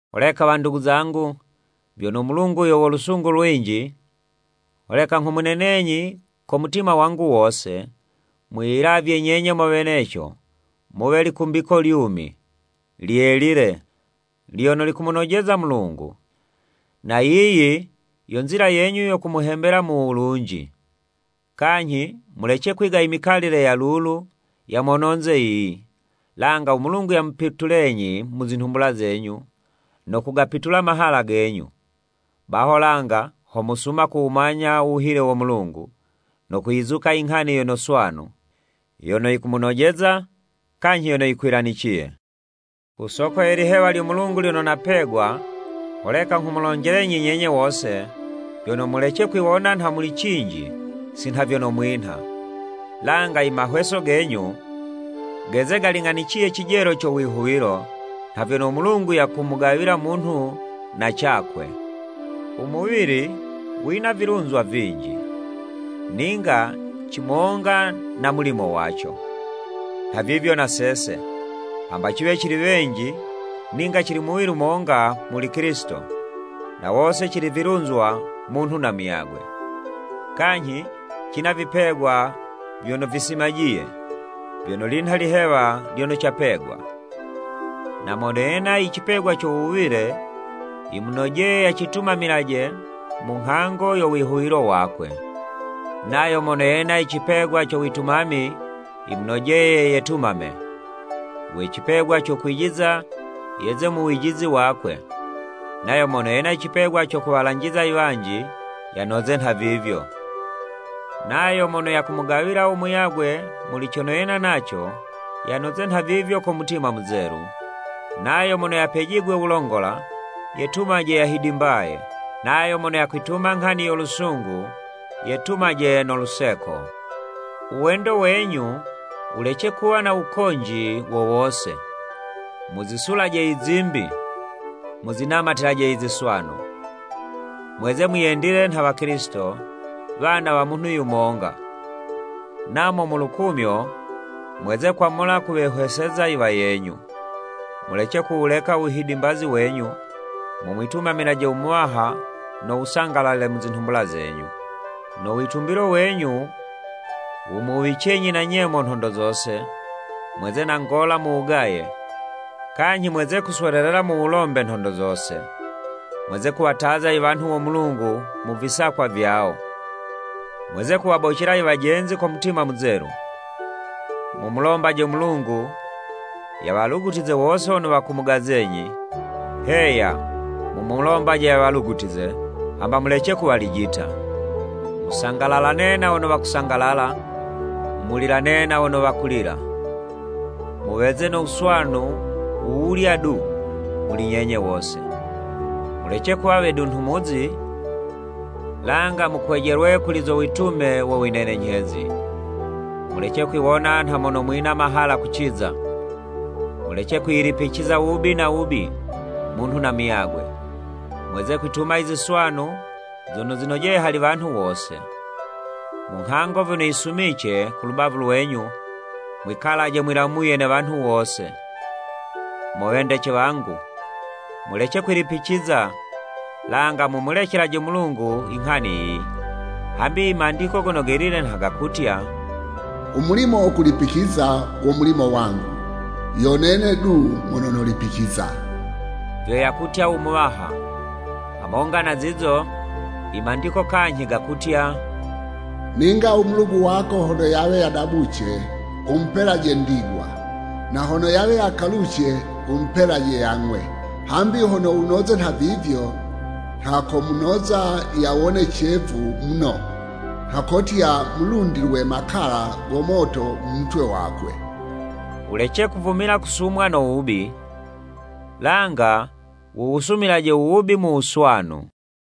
Holeka wandugu zangu, vyono u Mulungu yo wo lusungu lwinji, holeka nghumunenenyi ko mutima wangu wose, mwiyilavye nyenye mo weneco muwe likumbiko lyumi, lyelile, lyono likumunojeza u Mulungu. Na yiyi yo nzila yenyu yo kumuhembela mu wulunji. Kanyhi mulece kwiga imikalile ya lulu ya mononze yiyi, langa u Mulungu yamupitulenyi mu zinhumbula zenyu ko kugapitula imahala genyu. Baho langa ho mosuma kuwumanya u wuhile wo Mulungu, no kuyizuka inghani yono swanu, yono yikumunojeza, kanyhi yono yikwilaniciye. Ku soko ye lihewa lyo Mulungu lyono napegwa, holeka nghumulonjelenyi nyenye wose, vyono, mulece kwiwona nha muli cinji si nha vyono mwinha. Langa imahweso genyu, geze galing'aniciye cijelo co wihuwilo, nha vyono u Mulungu yamugawila munhu na cakwe. U muwili wina vilunzwa vinji, ninga cimonga na mulimo waco. Nhavivyo na sese, hamba ciwe cili wenji, ninga cili muwili monga muli Kilisito, na wose cili vilunzwa munhu na muyagwe. Kanyhi, cina vipegwa vyono visimajiye, vyono linha ilihewa lyono capegwa. Na mono yena icipegwa co wuwile, yimunojeye yacitumamilaje mu nghango yo wihuwilo wakwe. Nayo mono yena icipegwa co witumami, yimunojeye yetumame. We cipegwa co kwijiza, yeze mu wijizi wakwe. Nayo mono yena icipegwa co kuwalanjiza iwanji, yanoze nhavivyo. Nayo mono yakumugawila u muyagwe muli cono yena naco, yanoze nhavivyo ko mutima muzelu. Nayo mono yapejigwe wulongola, yetumaje yahidimbaye. Nayo mono yakwituma nghani yo lusungu, yetumaje no luseko. U wendo wenyu, wulece kuwa na wukonji wo wose. Muzisulaje izimbi, muzinamatilaje iziswanu. Mweze mwiyendile nha Wakilisito, wana wa munhu yumonga, namo mu lukumyo, mweze kwamula kuwehweseza iwayenyu. Mulece kuwuleka u wuhidimbazi wenyu, mumwitumamilaje u Muwaha no wusangalale mu zinhumbula zenyu. No witumbilo wenyu wumuwicenyi na nyemo nhondo zose, mweze na ngola mu wugaye, kanyhi mweze kuswelelela mu wulombe nhondo zose. Mweze kuwataza iwanhu wo Mulungu mu visakwa vyawo, mweze kuwabocela iwajenzi ko mutima muzelu. Mumulombaje u Mulungu, yawalugutize wose wono wakumugazenyi, heya, mumulombaje yawalugutize, hamba mulece kuwalijita. Musangalalane na wono wakusangalala, mulilane na wono wakulila. Muweze no wuswanu wu wulya du, muli nyenye wose. Mulece kuwa wedunhumuzi, langa mukwejelwe kuli zo witume wo winenenyhezi. Mulece kwiwona nha mono mwina mahala kuciza. Mulece kwiyilipiciza wubi na wubi, munhu na muyagwe. Mweze kwituma i ziswanu zono zinojeye hali wanhu wose. Mu nghango vyono yisumice ku lubavu lwenyu, mwikalaje mwilamuye ne wanhu wose. Mo wendece wangu, mulece kwilipiciza, langa mumulecelaje u Mulungu inghani yiyi, hambi i Mandiko Gono Gelile nha gakutya, “U mulimo wo kulipiciza wo mulimo wangu, yo nene du mono nolipiciza, vyo yakutya u Muwaha.” Hamonga na zizo, i Mandiko kanyhi gakutya, “Ninga u mulugu wako hono yawe yadabuce, wumupelaje ndigwa, na hono yawe yakaluce, umupelaje yang'we. Hambi hono wunoze nhavivyo, nha komunoza yawone cevu muno, nha kotya mulundilwe makala go moto mu mutwe wakwe.” Wulece kuvumila kusumwa no wubi, langa wuwusumilaje u wubi mu wuswanu.